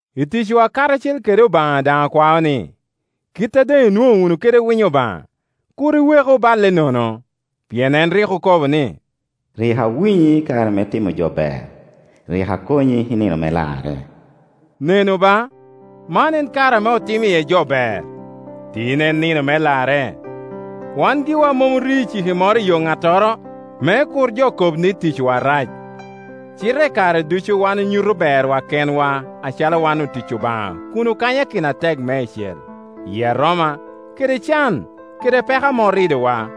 I ticwa karacel kede Obaŋa daŋ okwao ni, kit a doŋ inwoŋo wunu kede winyo Obaŋa, kur iweku balle nono. Pien en rik okobo ni, “Rik awinyi i kare me timo jo ber, rik akonyi i nino me larre.” Nenu ba, man en kare ame otimmi iye jo ber. Tin en nino me larre. Wan giwa mom orio iciki moro i yo ŋattoro, me kur jo kob ni ticwa rac; cite i kare ducu wan onyuto berwa kenwa acalo wan otic Obaŋa kun okanyakino atek meicel, i aroma kede can kede peko ame oridowa.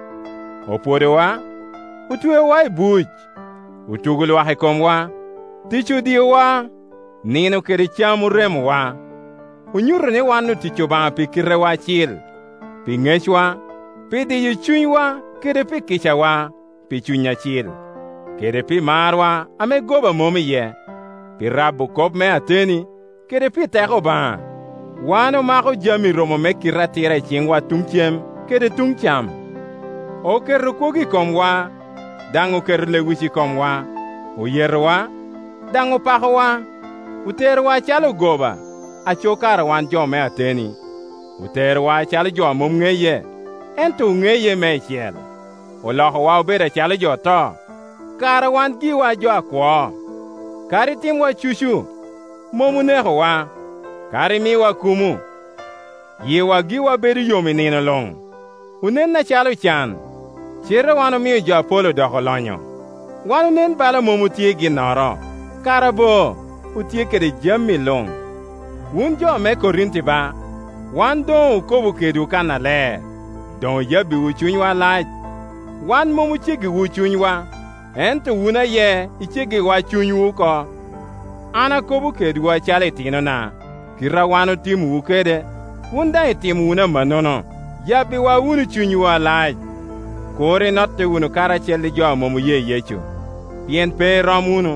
Opwodowa, otweowa i buc, otugo Iwak i komwa; tic odiowa, nino kede cam oremowa. Onyuto ni wan otic Obaŋa pi kitewa acil, pi ŋecwa, pi diyo cunywa kede pi kicawa; pi Cuny Acil, kede pi marwa ame goba mom iye, pi rabo kop me ateni, kede pi teko Obaŋa. Wan omako jami romo me kite atira i ciŋwa tuŋ cem kede tuŋ cam. Oketo kwogo i komwa, daŋ oketo lewic i komwa; oyetowa, daŋ opakowa. Oterowa acalo ogoba, aco kara wan jo me ateni. Oterowa acalo jo a mom ŋeye, ento oŋeye meicel. Olokowa obedo acalo jo oto, kara wan giwa jo akwo. Kadi timwa cucu, mom onekowa; kadi miwa kumo, yiwa giwa bedo yom i nino luŋ; onen acalo ocan, cite wan omio jo apol odoko olonyo; wan onen bala mom otye i ginnoro, kara bo otye kede jami luŋ. Wun jo me Korinti ba, wan doŋ okobo kedwu kannaler, doŋ oyabbiwu cunywa alac. Wan mom oceggiwu cunywa, ento wun aye iceggiwa cunywu oko. An akobo kedwu acalo itinona; kite a wan otimowu kede, wun daŋ itimo wunu amannono; yabbiwa wunu cunywu alac. Kur inotte wunu karacel ŋo a mom oye Yecu, pien pe irom wunu.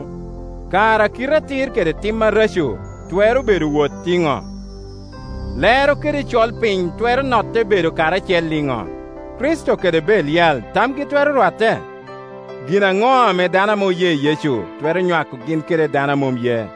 Kara kite atir kede tim areco twero bedo owot iŋo? Lero kede colpiny twero notte bedo karacel iŋo? Kricito kede Belial tamgi twero rwatte? Gin aŋo ame dano ame oye Yecu twero nywako gin kede dano a mom ye?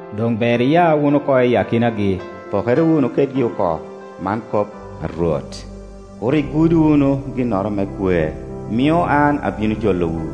Doŋ ber iya wunu oko i akinagi, pokere wunu kedgi oko, man kop, a Rwot, kur igud wunu ginnoro me kwer; mio an abino jolowu,